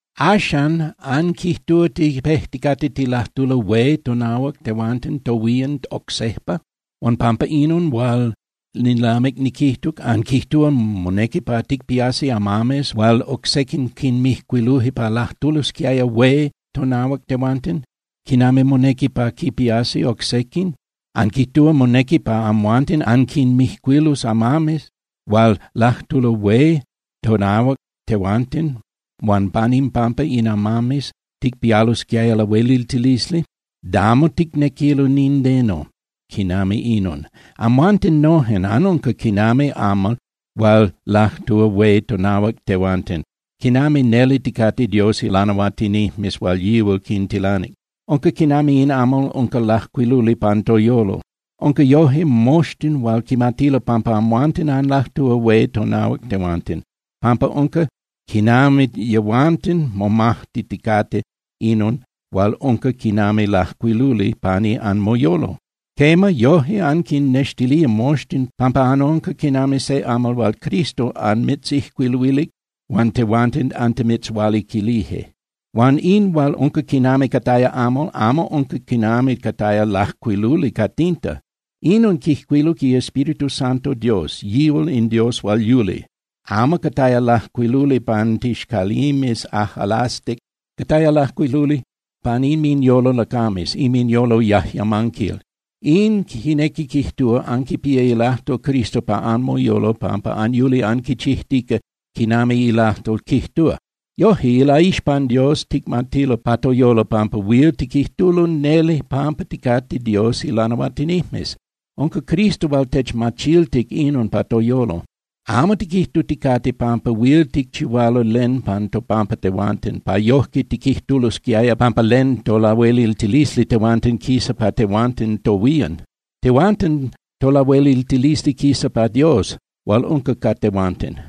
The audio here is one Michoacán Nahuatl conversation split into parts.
Axan, ¿anquijtúa tipejticate tilajtulo hué tonahuac tehuanten tohuían oc sejpa? Huan pampa inon hual nilamic niquijtuc, ¿anquijtúa monequi pa ticpiasi amames hual oc sequin quinmijcuiluje pa lajtulosquiaya hué tonahuac tehuanten, quinami monequi pa quipiasi oc sequin? ¿Anquijtúa monequi pa amhuanten anquinmijcuilus amames hual lajtulo hué tonahuac tehuanten huan pan impampa in amames ticpialosquiaya lahueliltilisli? Damo ticnequilo nindeno quinami inon. Amhuanten nojen anunca quinami amal hual lajtúa hué tonahuac tehuanten quinami neli ticate Dios ilanahuatinijmes hual yihual quintilanic. Unca quinami in amal unca lajcuiluli pan toyolo. Huan yoje, moxtin huil quimatilo pampa amhuanten anlajtúa hué tonahuac tehuanten, pampa unca quinami yehuanten momaxtiticate inon hual unca quinami lajcuiluli pani anmoyolo. Quema, yoje anquinnextilía moxtin pampa anunca quinami se amal hual Cristo anmitzijcuiluilic huan tehuanten antimitzhualiquilije. Huan in hual unca quinami cataya amal, amo unca quinami cataya lajcuiluli ca tinta. Inon quijcuiluc iEspíritu Santo Dios, yihual in Dios hual yuli. Amo cataya lajcuiluli pan tixcalimes ajꞌalastic. Cataya lajcuiluli pan inminyolo lacames, inminyolo yajyamanquil. In quinequi quijtúa anquipía ilajtol Cristo pa anmoyolo pampa anyuli anquichijtica quinami ilajtol quijtúa. Yojque, ilaixpan Dios ticmatilo pa toyolo pampa huil tiquijtulo neli pampa ticate Dios ilanahuatinijmes. Unca Cristo hual techmachiltic inon pa toyolo. Amo tiquijtuticate pampa huil ticchihualo len pan topampa tehuanten, pa yojque tiquijtulosquiaya pampa len tolahueliltilisli tehuanten quisa pa tehuanten tohuían. Tehuanten tolahueliltilisli quisa pa Dios hual unca ca tehuanten.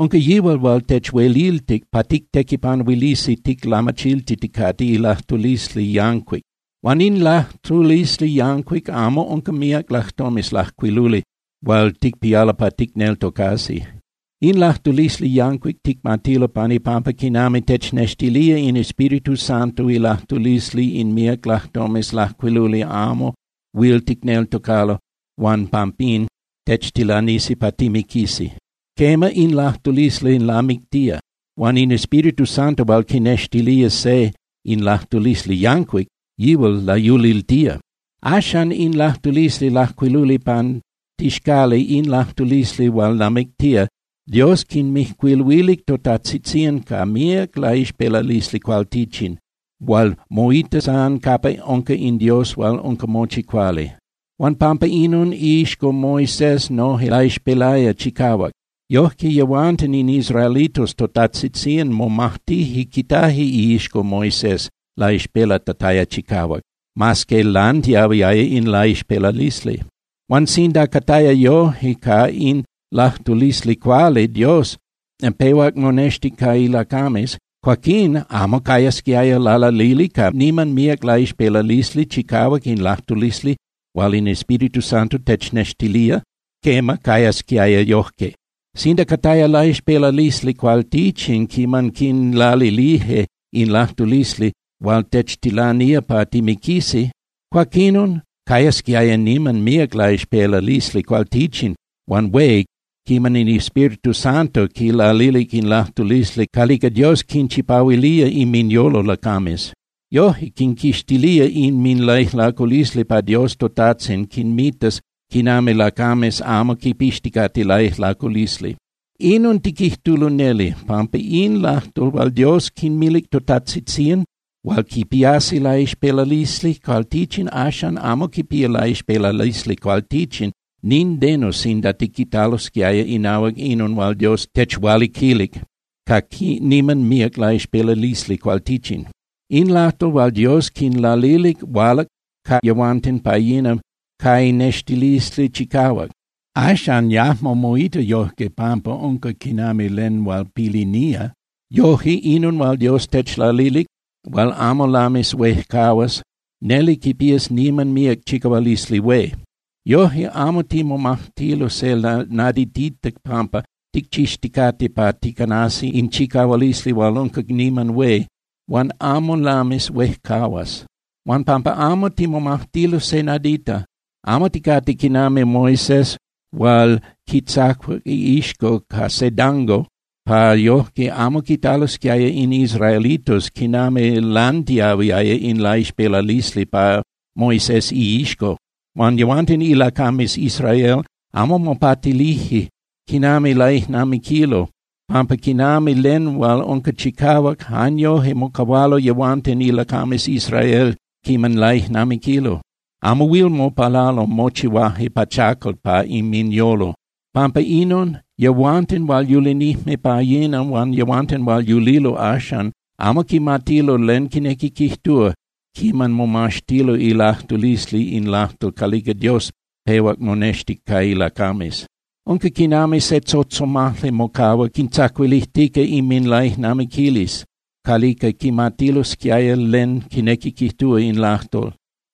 Unca yihual hual techueliltic pa tictequipanuilisi ticlamachiltiticate ilajtulisli yancuic. Huan in lajtulisli yancuic amo unca míac lajtomes lajcuiluli hual ticpialo pa ticneltocasi. In lajtulisli yancuic ticmatilo pan ipampa quinami technextilía in Espíritu Santo. Ilajtulisli in míac lajtomes lajcuiluli amo huil ticneltocalo huan pampín techtilanisi pa timiquisi. Quema, in lajtulisli lamictía. Huan in Espíritu Santo hual quinextilía se in lajtulisli yancuic, yihual layuliltía. Axan, in lajtulisli lajcuiluli pan tixcali, in lajtulisli hual lamictía, Dios quinmijcuiluilic totajtzitzían ca míac laixpelalisli cualtichin hual moita san capa unca in Dios hual unca mochi cuali. Huan pampa inon, iixco Moisés noje laixpelaya chicahuac. Yoje yehuanten in israelitos totajtzitzían momajtije quitaje iixco Moisés laixpelatataya chicahuac, mas que lantiahuiaya in laixpelalisli. Huan sinda cataya yojque ca in lajtulisli calica Dios pehuac monextic ca ilacames, cuaquín ¿amo cayasquiaya lalalili ca niman míac laixpelalisli chicahuac in lajtulisli hual in Espíritu Santo technextilía? Quema, cayasquiaya yojque. Sinda cataya laixpelalisli cualtichin quiman quinlalilije in lajtulisli hual techtilanía pa timiquisi, cuaquinon cayasquiaya niman míac laixpelalisli cualtichin huan hué quiman in Espíritu Santo quilalic in lajtulisli calica Dios quinchipahuilía inminyolo lacames. Yoje quinquixtilía inminlaijlaculisli pa Dios toTajtzin quinmitas quinami lacames amo quipixticate laijlaculisli. Inon tiquijtulo neli, pampa in lajtol hual Dios quinmilic totajtzitzían hual quipiani laixpelalisli cualtichin axan amo quipía laixpelalisli cualtichin nindeno sinda tiquitalosquiaya inahuac inon hual Dios techualiquilic ca niman míac laixpelalisli cualtichin. In lajtol hual Dios quinlalilic hualac ca yehuanten pa yina ca lanextilisli chicahuac. Axan yajmo moita yojque pampa unca quinami len hual pilinía. Yoje, inon hual Dios techlalilic hual amo lamis huejcahuas, neli quipías niman míac chicahualisli hué. Yoje, amo timomajtilo se naditita pampa ticchixticate pa ticanasi in chicahualisi hual unca niman hué huan amo lamis huejcahuas. Huan pampa amo timomajtilo se nadita, amo ticate quinami Moisés hual quitzacuac iixco ca se dango pa yojque amo quitalosquiaya in israelitos quinami lantiahuiaya in laixpelalisli pa Moisés iixco. Huan yehuanten ilacames Israel amo mopatilije quinami laijnamiquilo, pampa quinami len hual unca chicahuac, jan yoje mocahualo yehuanten ilacames Israel quiman laijnamiquilo. Amo huil mopalalo, mochihuaje pachacal pa inminyolo. Pampa inon, yehuanten hual yulinijme pa yina huan yehuanten hual yulilo axan amo quimatilo len quinequi quijtúa quiman momaxtilo ilajtulisli in lajtol calica Dios pehuac monextic ca ilacames. Unca quinami se tzotzomajli mocahua quintzacuilijtica inminlaijnamiquilisli calica quimatilosquiaya len quinequi quijtúa in lajtol.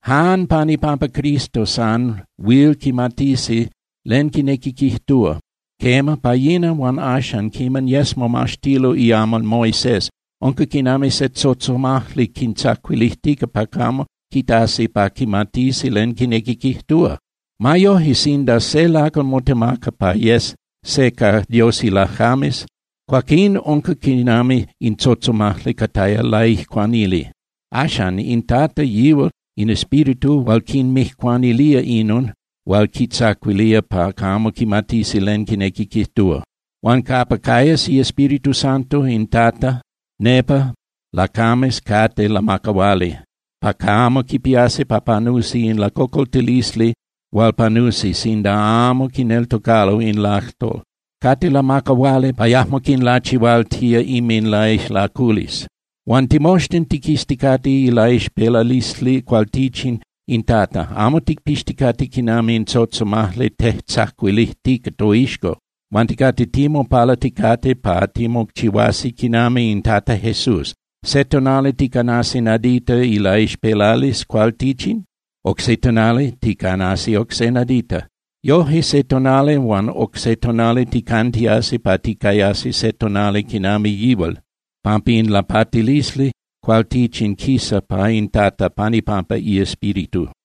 Jan pan ipampa Cristo san huil quimatisi len quinequi quijtúa. Quema, pa yina huan axan, quiman yes momaxtilo iamal Moisés, unca quinami se tzotzomajli quintzacuilijtica pa camo quitasi pa quimatisi len quinequi quijtúa. Ma yoje, sinda se lacal motemaca pa yes se ca Dios ilacames, cuaquín unca quinami in tzotzomajli cataya laijcuanili. Axan, in Tata, yihual in Espíritu hual quinmijcuanilía inon hual quintzacuilía pa camo quimatisi len quinequi quijtúa. Huan capa cayas iEspíritu Santo in Tata, nepa lacames cate lamacahuali pa camo quipiasi pa panusi in lacocoltilisli hual panusi sinda amo quineltocalo in lajtol. Cate lamacahuali pa yajmo quinlachihualtía inminlaijlaculisli. Huan timoxtin tiquizticate ilaixpelalisli cualtichin in Tata, amo ticpixticate quinami in tzotzomajli tejtzacuilijtica toixco. Huan ticate timopalaticate pa timochihuasi quinami in Tata Jesús. Se tonali ticanasi nadita ilaixpelalisli cualtichin, oc se tonali ticanasi oc se nadita. Yoje, se tonali huan oc se tonali ticantiasi pa ticayasi se tonali quinami yihual, pampa in lapatilisli cualtichin quisa pa in Tata pan ipampa iEspíritu.